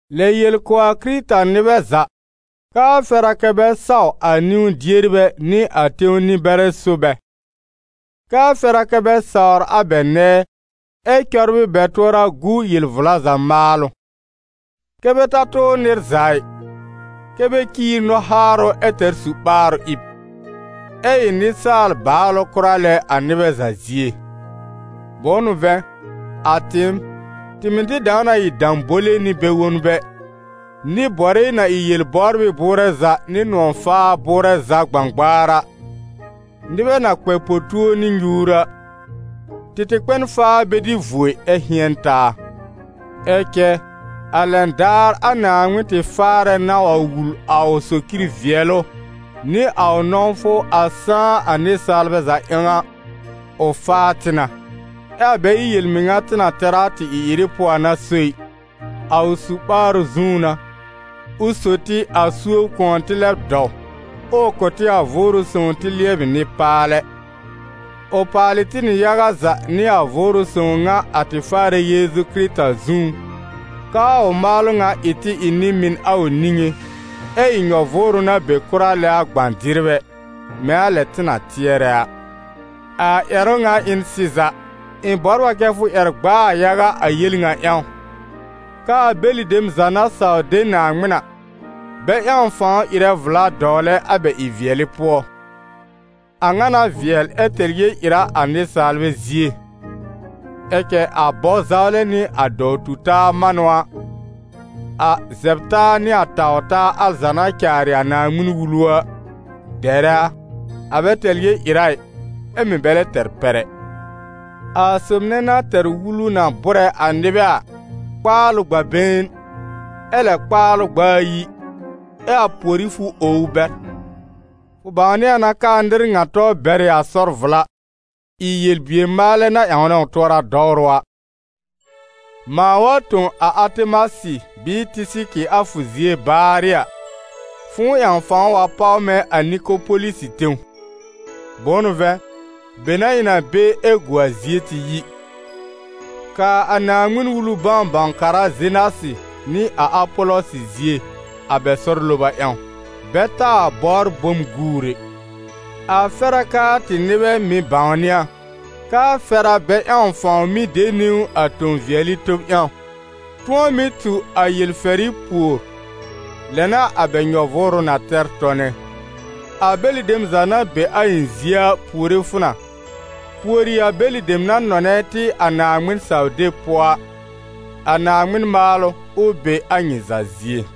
Lɛ yel kʋ̀ a Kɩrɩta-nɩbɛ za, k'aa fɛr a kɛ́ bɛ saw a niwn-dierbɛ nɩ a tẽw nɩ-bɛrɛ so bɛ. K'aa fɛr a kɛ́ bɛ sawr a bɛ nɛɛ, ɛ cɔbrɩ bɛ tʋɔra gu yel-vla za maalʋ. Kɛ́ bɛ ta tʋʋr nɩr za ɩ, kɛ́ bɛ ciir nɔ-haarʋ ɛ tɛr su-ɓaarʋ ɩb, ɛ ɩ nɩsaal-baalʋ kʋra lɛ a nɩbɛ za zie. Bʋ̃ʋ n'ʋ vɛ̃, a tɩɩm, tɩ mɩ̀ tɩ dãw na ɩ dãbole nɩ bɛ-wonbɛ, nɩ-bɔrɩ na ɩ yel-bɔbrɩ bʋʋrɛ za nɩ nʋ̃ɔ̀-faa-bʋʋrɛ za gbãgbaar a, nɩbɛ na kpɛ po-tuo nɩ nyuur a. Tɩ tɩ kpɛ n faa bɛ dɩ vuo ɩ, ɛ hɩ̃ɛn taa. Ɛ cɛ a lɛn daar a Naaŋmɩn tɩ Faarɛ na wa wul a ʋ socir vɩɛlʋ nɩ a ʋ nɔ̃wfʋ a sãá a nɩsaalbɛ za ƴãw a, ʋ faa tɩ na, ɛ a bɛ ɩ yel-mɩŋa tɩ na tɛr a tɩ ɩ-ɩrɩ pʋɔ a n'a so ɩ, a ʋ su-ɓaarʋ zũú n'a, ʋ sò tɩ a suob kʋ̃ɔ tɩ lɛb dɔw, ɛ ʋ kʋ tɩ a Vʋʋrʋ Sõw tɩ lɩɛbɩ nɩ-paalɛ. Ʋ paalɩ tɩ nɩ yaga za nɩ a Vʋʋrʋ Sõw ŋa a tɩ Faarɛ Yeezu Kɩrɩta zũú, k'aa ʋ maalʋ ŋa ɩ tɩ ɩ nɩ-mɩn a ʋ niŋé, ɛ́ ɩ nyɔ-vʋʋrʋ na be kʋra lɛ a gbã-dɩrbɛ, mɛ̃ a lɛ tɩ na tɩɛrɛ a. A ƴɛrʋ ŋa ɩ n sɩza. Ɩ̃ bɔbr a kɛ́ fʋ ƴɛr gb'a a yaga a yele a ŋa ƴãw, k'aa bɛlɩ dem za na saw de Naaŋmɩn a, bɛ ƴãw fãw ɩrɛ vla dɔwlɛ a bɛ ɩ-vɩɛlɩ pʋɔ. A ŋa n'a vɩɛl ɛ tɛr yel-ɩra a nɩsaalbɛ zie. Ɛ cɛ a bɔ-zawlɛ nɩ a dɔw-tu-taa manʋ a, a zɛb-taa nɩ a taw-taa al za na caarɩ a Naaŋmɩn-Wulu a, dɛrɛ a: a bɛ tɛr yel-ɩra ɩ, ɛ mɩ̀ bɛ lɛ tɛr pɛr ɛ. A sob nɛ na tɛr wulu na bʋ́rɛ a nɩbɛ a, kpaal ʋ gb'a-been, ɛ lɛ kpaal ʋ gb'a ayi, ɛ a pùorí fʋ ow ʋ bɛr. Fʋ bãwnɩ a na k'aa nɩr ŋa tɔ bɛr ɩ a sɔr-vla, ɩ yel-bier-maalɛ na ƴãwnɛ ʋ tʋɔra dɔwrʋ a. Mãa wa tõ a Atemasɩ bɩɩ Tɩsɩkɩ a fʋ zie baarɩ a, fʋ̃ʋ ƴãw fãw wa páw mɛ̃ a Nikopolisɩ tẽw. Bʋ̃ʋ n'ʋ vɛ̃, be n'a ɩ̃ na be ɛ gu a zie tɩ yi. Kaa a Naaŋmɩn-Wulu bãw-bãw-kara Zenasɩ nɩ a Apɔlɔsɩ zie, a bɛ sɔr loba ƴãw, bɛ taa bɔbr bom guur ɛ. A fɛr a k'aa tɩ nɩbɛ mɩ̀ bãwnɩ a, k'aa fɛr a bɛ ƴãw fãw mɩ́ de niwn a tõ-vɩɛlɩ tob ƴãw, tʋ̃ɔ mɩ́ tu a yel-fɛrɩ pùor, lɛ n'a a bɛ nyɔ-vʋʋrʋ na tɛr tɔnɛ. A bɛlɩ dem za na be a ɩ̃ zie a puore fʋ na. Puori a bɛlɩ dem na nɔnɛ tɩ a Naaŋmɩn-saw-deb pʋɔ a. A Naaŋmɩn maalʋ, ʋ be a nyɩ za zie.